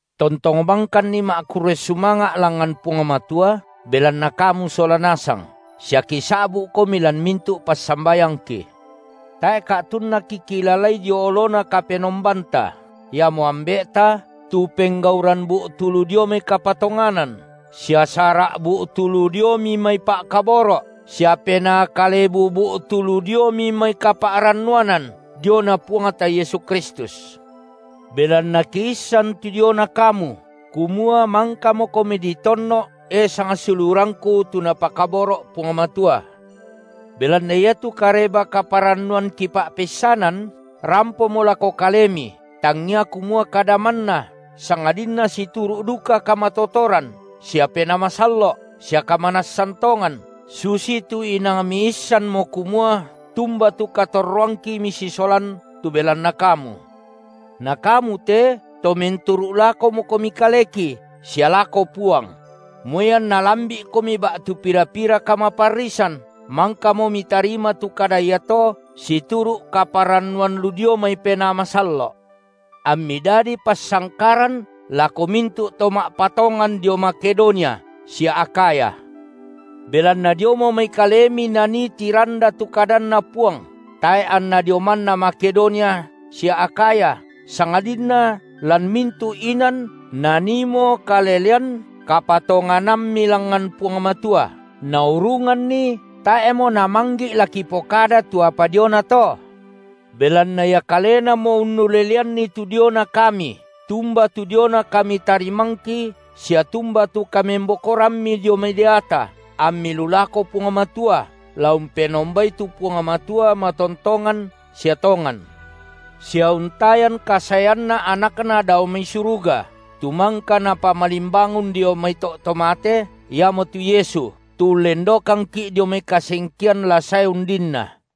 Tontong bangkanni ma’kurre sumanga’ langngan Puang Matua belanna kamu sola nasang sia kisa’bu’komi lan mintu’ passambayangki. Tae’ ka’tunna kikilalai dio oloNa Kapenombanta, iamo Ambe’ta, tu penggauran bu’tu lu diomi mai kapatonganan, sia sara’ bu’tu lu diomi mai pa’kaboro’, sia penaa kalebu ba’tu lu diomi mai kapa’rannuanan diona Puangta Yesu Kristus. Belanna kiissan tu diona kamu, kumua mangkamokomi ditonno’, e sangsiulurangku tu Napakaboro’ Puang Matua. Belanna iatu Kareba-kaparannuan kipa’peissanan, rampomo lako kalemi tangia kumua kada manna, sangadinna situru’ duka kamatotoran sia Penaa Masallo’ sia kamanassan tongan, susitu inang miissanmo kumua tumba tu katorroangki misisolan tu belanna kamu. Na kamu te to menturu’ lakomokomi kaleki sia lako Puang; moi anna lambi’komi ba’tu pira-pira kamaparrisan, mangkamo mitarima tu kada iato situru’ kaparannuan lu dio mai Penaa Masallo’, ammi dadi passangkaran lako mintu’ to ma’patongan dio Makedonia sia Akhaya. Belanna diomo mai kalemi nanii tiranda tu kadanNa Puang, tae’ anna dio manna Makedonia sia Akhaya, sangadinna lan mintu’ inan naniimo kalelean kapatonganammi langngan Puang Matua, naurunganni tae’mo namanggi’ la kipokada tu apa diona to. Belanna ia kalenamo unnuleleanni tu diona kami, tumba tu diona kamitarimangki sia tumba tu kamembokorammi dio mai deata, ammi lu lako Puang Matua, la umpenombai tu Puang Matua matontongan sia tongan, sia untayan kasaeanNa AnakNa dao mai suruga, tu mangka Napamalimbangun dio mai to’ to mate, iamotu Yesu, tu ullendokangki’ dio mai kasengkean la sae undinna.